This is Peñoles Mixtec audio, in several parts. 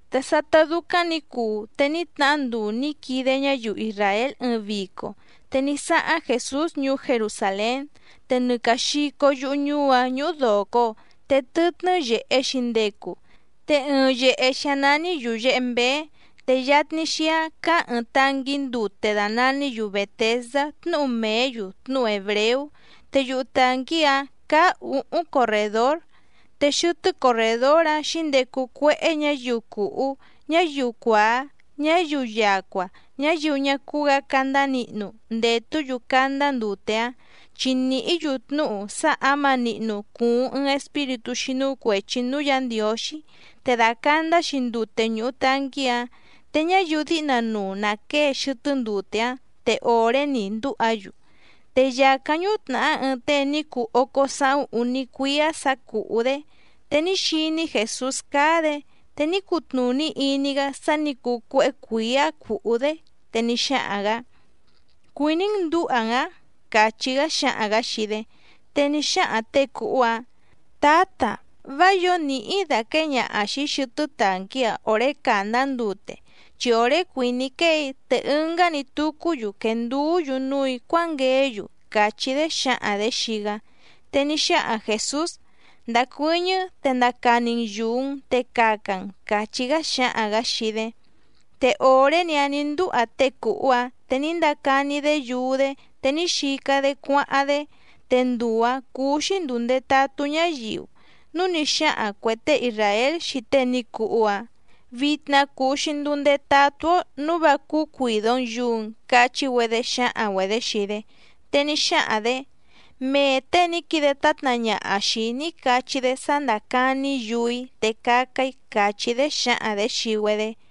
Te sátá dúcáⁿ nǐ cuu, te ní tnahá nduu nǐ quide ñáyiu isràél ɨɨⁿ vico. Te ní sáháⁿ Jèsús ñuú Jerusàlén. Te nɨ càa xico yuhu ñuú‑áⁿ ñúhú dòco, te tɨtnɨ́ yèhe‑xi ndecu. Te ɨɨⁿ yèhe‑xi‑áⁿ nání Yùyehe Mbéé, te yatni xíáⁿ cáá ɨ̀ɨⁿ tanquí ndute dàna‑ní‑yu Bètesdá tnúhu mèé‑yu tnúhu hèbreú, te yuhu tànquí‑áⁿ cáá ǔhúⁿ corrèdór. Te xɨtɨ́ corrèdór‑áⁿ xǐndecu cuéhé ñǎyiu cùhú, ñáyiu cuàá, ñáyiu yacua, ñáyiu ñá cúú‑gǎ candá nihnu, ndètú‑yu candá ndute‑áⁿ. Chi nìhí‑yu tnúhu sá ǎma nihnu cùuⁿ ɨɨⁿ espíritú xínú cuèchi núú Yǎ Ndiǒxí, te dàcandá‑xi ndute ñùhu tanquí‑áⁿ. Te ñáyiu díhna nuu nà quée xɨtɨ́ ndute‑áⁿ, te òré‑ni ndúha‑yu. Te yàcáⁿ ñútnàhá ɨɨⁿ tée ní cuu ócó sáhúⁿ úní cuíá sǎ cùhú‑dé. Te ní xiní Jèsús cáá‑dě, te ní cutnùní iní‑gá sá nǐ cuu cuéhé cuǐá cùhú‑dé, te ní xáhaⁿ‑gǎ: —¿Cuìní‑n ndǔha‑n‑ǎⁿ? —càchí‑gá xáhaⁿ‑gǎ xii‑dé. Te ní xáhaⁿ těe cùhú‑áⁿ: —Tǎta, vá yǒo nìhí‑í dàquée ñaha xìi‑í xɨtɨ́ tànquí‑a òré càndá ndute, chi òré cuìní‑í quée‑í, te ɨngá‑ni tucú‑yu quènduú‑yu núù‑í cuángueé‑yu —càchí‑dé xǎhaⁿ‑dě xii‑gá. Te ní xáhaⁿ Jèsús: —Ndacuɨ́ñɨ́, te ndaca‑ni‑n yùu‑n, te caca‑n —càchí‑gá xáhaⁿ‑gǎ xii‑dé. Te òré‑ni‑áⁿ nǐ ndúha tée cùhú‑áⁿ, te ní ndaca‑ni‑dé yuu‑dé, te ní xica‑dé cuáháⁿ‑dé. Te nduu‑ǎⁿ cúú‑xí ndùu ndetatú ñáyiu, núu ní xáhaⁿ cuè tée isràél xii tée ní cuhu‑áⁿ: —Vitna cùu‑xi nduu ndetatú‑ó nǔu vá cúú cuìdo‑n yuu‑n —cachí‑güedé xǎhaⁿ‑güedě xii‑dé. Te ní xáhaⁿ‑dě: —Mee těe ní quide tátna ñaha xìi‑í ní cachí‑dé sá ndácàni‑í yuu‑í, te caca‑í —càchí‑dé xǎhaⁿ‑dě xii‑güedé.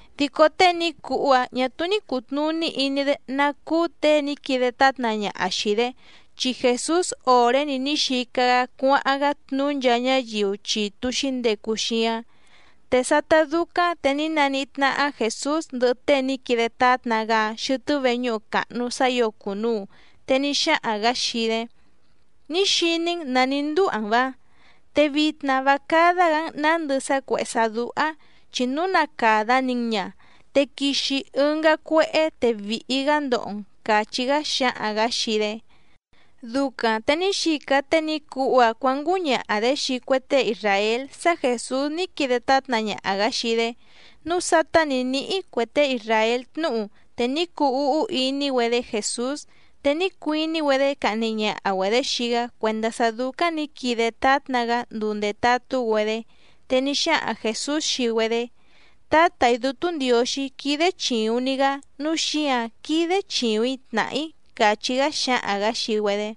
Dico tée ní cuhú‑áⁿ ñà túú ní cùtnuní iní‑dé ná cúú těe ní quide tátna ñaha xìi‑dé, chi Jèsús òré‑ni ní xica‑gá cuáháⁿ‑gá tnuú nchaa ñáyiu chitu xǐndecu xíáⁿ. Te sátá dúcáⁿ te ní naníhí tnáhá Jèsús ndɨhɨ tée ní quide tátna‑gá‑áⁿ xɨtɨ́ veñúhu càhnu sá ǐo cùnuu, te ní xáhaⁿ‑gǎ xii‑dé: —Ní xiní‑n nǎ ní ndúha‑n‑va. Te vitna vá cádá‑gǎ‑n nǎndɨ sá cuèhé sá dúhá, chi núu na càda‑ni‑n ña, te quixi ɨngá cuéhé, te vìhi‑gá ndoho‑n —càchí‑gá xáhaⁿ‑gǎ xii‑dé. Ducaⁿ te ní xica tée ní cuhú‑áⁿ cuǎngúñaha‑dě xii cue tée isràél sá Jèsús ní quide tátna ñaha‑gǎ xii‑dé. Núu sátá nǐ níhí cue tée isràél tnúhu, te ní cuu úhú iní‑güedé Jèsús. Te ní cuiní‑güedé cahni ñaha‑güedě xii‑gá cuèndá sá dúcáⁿ nǐ quide tátna‑gá nduu ndètatú‑güedé. Te ní xáhaⁿ Jèsús xii‑güedé: —Tǎtà‑í Dútú Ndiǒxí quídé chìuⁿ‑ni‑gá nǔu xíǎⁿ quídé chìuⁿ‑í tnàhá‑í —càchí‑gá xáhaⁿ‑gǎ xii‑güedé.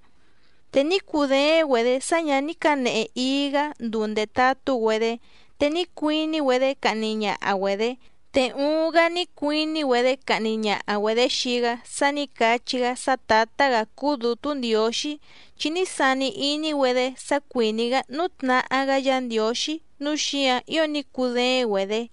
Te ní cudééⁿ‑güedě sá ñǎ ní cǎnehe íí‑gǎ nduu ndètatú‑güedé, te ní cuiní‑güedé cahni ñaha‑güedě, te uuⁿ‑gá ní cuiní‑güedé cahni ñaha‑güedě xii‑gá sá nǐ cachí‑gá sá Tǎtá‑gǎ cúú Dǔtú Ndiǒxí, chi ní sani iní‑güedé sá cuìní‑gá nútnahá‑gá Yǎ Ndiǒxí nǔu xíǎⁿ ío ní cudééⁿ‑güedě.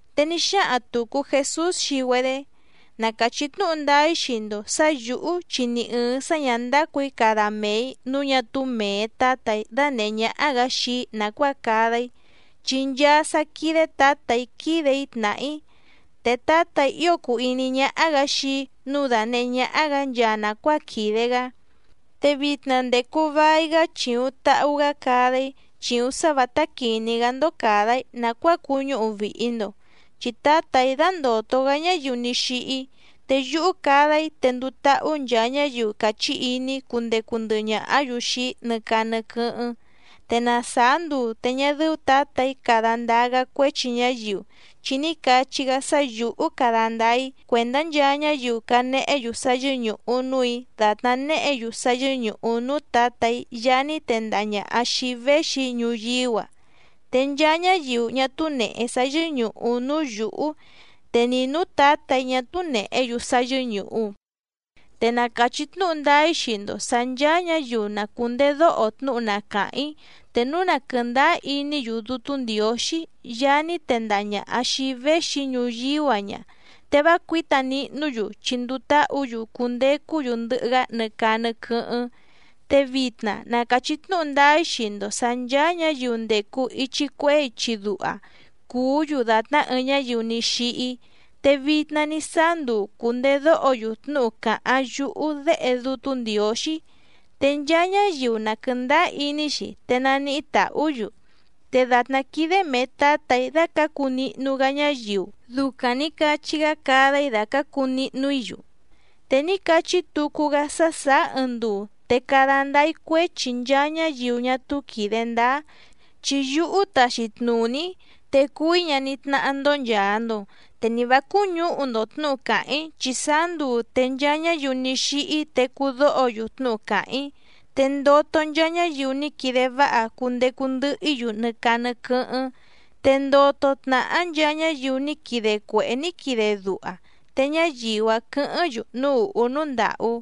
Te ní xáhaⁿ tùcu Jesús xii‑güedé: —Na càchí tnúhu ndáá‑í xii‑ndo sǎ yǔhú chi ni ɨ̀ɨⁿ sá ñǎ ndácù‑í cada mee‑ǐ nǔu ñá túú mèe Tátà‑í dánèhé ñáhá‑gǎ xii‑í nàcuáa cada‑í, chi nchaa sá quídé Tǎtà‑í quídè‑í tnàhá‑í. Te Tǎtà‑í ío cùu iní ñáhá‑gǎ xii‑í nǔu dànehé ñáhá‑gǎ nchaa nàcuáa quìde‑gá. Te vitna ndècu vai‑gá chìuⁿ tahu‑gá cada‑í, chìuⁿ sá vǎtá quìní‑gá‑ndó càda‑í nàcuáa cuñúhu vìhi‑ndo. Chi Tǎtà‑í dandòto‑gá ñáyiu ní xíhí. Te yúhú cada‑í te nduu táhú nchaa ñáyiu càchí iní‑í cundecu ndɨhɨ ñàhá‑yu xii‑í nɨ caa nɨ quɨ́hɨ́ⁿ. Te na sàá nduu te ñá dɨ́ú Tǎtà‑í cada ndáá‑gá cuéchi ñáyiu, chi ní cachí‑gá sá yǔhú cada ndáá‑í cuèndá nchaa ñáyiu canehé‑yu sá yɨ́ñùhu núù‑í dàtná néhě‑yu sá yɨ́ñùhu núú Tǎtà‑í Yaá ní tendaha ñàha xii‑í véxi‑í ñuyíú‑a. Te nchaa ñáyiu ñá túú nèhe sá yɨ́ñùhu núú yǔhú, te ni nǔú Tǎtà‑í ñá túú nèhé‑yu sá yɨ́ñùhu. ’Te na càchí tnúhu ndáá‑í xii‑ndo sǎ nchàa ñáyiu na cùndedóho tnúhu na càháⁿ‑í, te núu na quɨ̀ndáá iní‑yu Dútú Ndiǒxí Yaá ní tendaha ñàha xii‑í véxi‑í ñuyíú‑a ña, te vá cuǐta nihnú‑yu chi nduu táhǔ‑yu cundecú‑yu ndɨhɨ‑gá nɨ caa nɨ quɨ́hɨ́ⁿ. Te vitna na càchí tnúhu ndáá‑í xii‑ndo sǎ nchàa ñáyiu ndècu ichi cuehé ichi duha cùú‑yu dàtná ɨɨⁿ ñáyiu ní xíhí, te vitna ní sáá nduu cùndedóho‑yu tnúhu càháⁿ yúhú Déhe Dútú Ndiǒxí, te nchaa ñáyiu na quɨ̀ndáá iní‑xi, te naníhí tàhú‑yu. Te dàtná quídé mèe Tátà‑í dácǎcu nihnu‑gá ñáyiu, ducaⁿ nǐ cachí‑gá cada‑í dàcácu nihnu‑í‑yu. Te ní cachí tucu‑gá sá sàá ɨɨⁿ nduu, te cada ndáá‑í cuéchi nchaa ñáyiu ñá túú quìde ndáá, chi yúhú táxí tnùní‑í, te cùu‑í ñaní tnáhá‑ndó nchàa‑ndo. Te ni vǎ cúñǔhu‑ndo tnǔhu càháⁿ‑í, chi sáá nduu te nchaa ñáyiu ní xíhí tecú dóho‑yu tnúhu càháⁿ‑í. Te ndoto nchaa ñáyiu ní quide váha cundecu ndɨhɨ‑í‑yu nɨ caa nɨ quɨ́hɨ́ⁿ, te ndoto tnàhá nchaa ñáyiu ní quide cuèhé ní quide duha, te ñáyiu‑áⁿ quɨ̌hɨ́ⁿ‑yu núú ùhú núú ndàhú.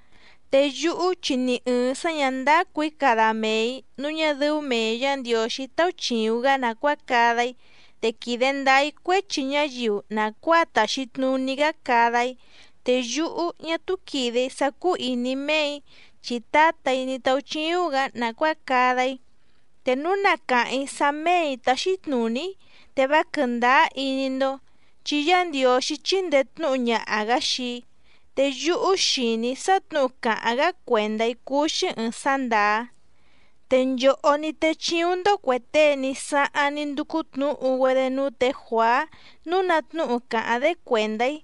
’Te yúhú, chi ni ɨ̀ɨⁿ sá ñǎ ndácù‑í cada mee‑ǐ nǔu ñá dɨ́ú mèe Yá Ndiǒxí táúchìuⁿ‑gá nàcuáa cada‑í. Te quìde ndáá‑í cuéchi ñáyiu nàcuáa tàxi tnuní‑gá cada‑í, te yúhú ñá túú quìde‑í sá cúú ìní méè‑í chi Tǎtà‑í ní táúchíúⁿ‑gǎ nàcuáa cada‑í. Te núu na càháⁿ‑í sá méè‑í táxí tnùní‑í, te vá quɨ̀ndáá iní‑ndó. Chi Yá Ndiǒxí chíndèe tnúhu ñaha‑gǎ xii‑í, te yúhú xìní‑í sá tnǔhu càháⁿ‑gá cuèndá‑í cúú‑xí ɨ̀ɨⁿ sá ndàá. Te nchòhó ní téchíúⁿ‑ndó cuè tée ní sáháⁿ ní ndúcú tnǔhu‑güedé núú tě Juàá nǔu ná tnúhu cáháⁿ‑dé cuèndá‑í,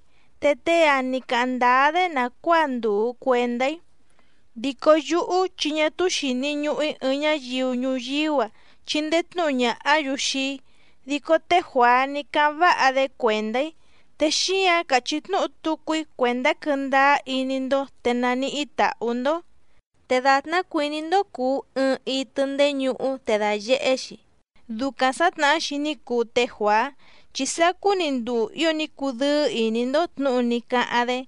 te tée‑ǎⁿ ní cáháⁿ ndáá‑dé nàcuáa ndùu cuendá‑í. Dico yúhú, chi ñá túú xìni ñuhu‑í ɨɨⁿ ñáyiu ñuyíú‑a chindee tnǔhu ñàhá‑yu xii‑í, dico té Juàá ní cáháⁿ váha‑dé cuèndá‑í, te xíǎⁿ càchí tnúhu tucu‑í cuèndá quɨ́ndáá iní‑ndó, te naníhí tàhú‑ndó. Te dàtná cuìní‑ndó cùu ɨɨⁿ itɨ ndéñuhú te dàyehé‑xi, ducaⁿ sǎtnahá‑xi ní cuu té Juàá, chi sacú‑ni nduu ío ní cudɨ́ɨ́ ìní‑ndó tnǔhu ní cáháⁿ‑dé.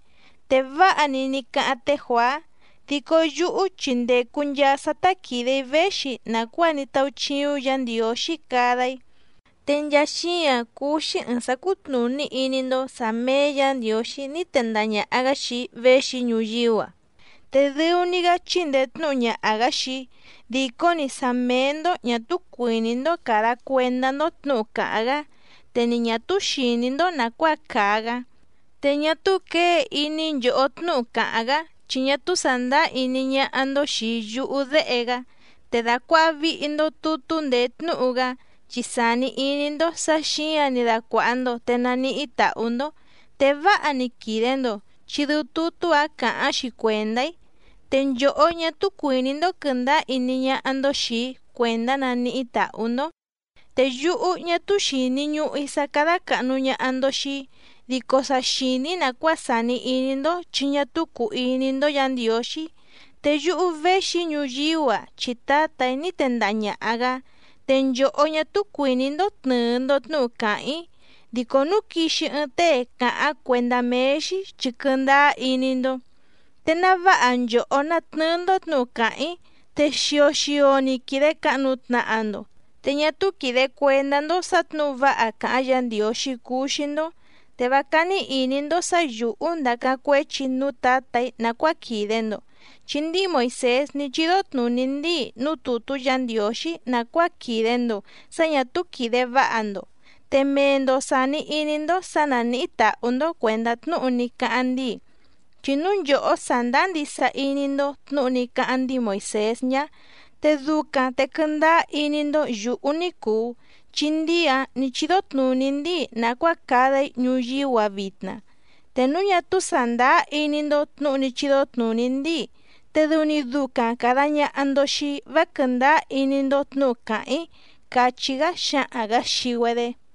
Te váha‑ni ní cáháⁿ té Juàá, dico yúhú chi ndècu nchaa sá tá quìde‑í véxi nàcuáa ní táúchíúⁿ Yǎ Ndiǒxí cada‑í, te nchaa xíǎⁿ cúú‑xí ɨ̀ɨⁿ sá cútnùní iní‑ndó sǎ méé Yǎ Ndiǒxí ní tendaha ñàha‑gá xii‑í véxi‑í ñuyíú‑a. Te dɨu‑ni‑gá chíndèe tnúhu ñaha‑gǎ xii‑í, dìcó‑ni sá méé‑ndó ñà túú cuìní‑ndó càda cuendá‑ndó tnǔhu càháⁿ‑gá, te ni ñà túú xìní‑ndó nàcuáa càa‑gá. Te ñá túú quěe iní nchòhó tnúhu càháⁿ‑gá, chi ñá túú sàndáá iní ñáhá‑ndó xìi yúhú Déhe‑gá. Te dàcuaha vihi‑ndo tutú ndèé tnúhu‑gá, chi sàni iní‑ndó sǎ xǐǎⁿ‑ni dacuàha‑ndo te naníhí tàhú‑ndó. Te váha‑ni quìde‑ndo, chi dɨu tutú‑áⁿ càháⁿ‑xi cuèndá‑í. Te nchòhó ñá túú cuìní‑ndó quɨ̀ndáá iní ñáhá‑ndó xìi‑í cuèndá naníhí tàhú‑ndó. ’Te yúhú, ñá túú xìni ñuhu‑í sá cádá càhnu ñaha‑ndo xii‑í. Dico sa xìní‑í nàcuáa sàni iní‑ndó chi ñá túú cùu iní‑ndó Yǎ Ndiǒxí. Te yúhú véxi‑í ñuyíú‑a chi Tǎtà‑í ní tendaha ñàha‑gá, te nchòhó ñá túú cuìní‑ndó tnɨ̀ɨ‑ndo tnúhu càháⁿ‑í, dico núu quixi ɨɨⁿ tée cáháⁿ cuèndá méé‑xí, chi quɨndáá iní‑ndó. Te ná váha nchòhó ná tnɨ́ɨ́‑ndó tnǔhu càháⁿ‑í, te xio xio‑ni quìde cahnu tnaha‑ndo, te ñá túú quìde cuendá‑ndó sǎ tnǔhu váha càháⁿ Yǎ Ndiǒxí cuu xii‑ndo. Te vá cání ìní‑ndó sǎ yǔhú ndàcáⁿ cuéchi‑í núú Tǎtà‑í nàcuáa quìde‑ndo, chi ndíi Moìsés ní chídó tnùní ndíi núú tùtú Yǎ Ndiǒxí nàcuáa quìde‑ndo sá ñà túú quìde váha‑ndo, te mee‑ndo sàni iní‑ndó sǎ nánìhí tàhú‑ndó cuèndá tnúhu ní cáháⁿ ndíi. Chi núu nchòhó sàndáá ndisa iní‑ndó tnǔhu ní cáháⁿ ndíi Moìsés ñá, te ducaⁿ te quɨndáá iní‑ndó yǔhú ní cùu, chi ndíi‑ǎⁿ ní chídó tnùní ndíi nàcuáa cada‑í ñuyíú‑a vitna. Te núu ñá túú sàndáá iní‑ndó tnǔhu ní chídó tnùní ndíi, te dɨu‑ni ducaⁿ càda ñaha‑ndo xii‑í vá quɨ̀ndáá iní‑ndó tnǔhu càháⁿ‑í —càchí‑gá xáhaⁿ‑gǎ xii‑güedé.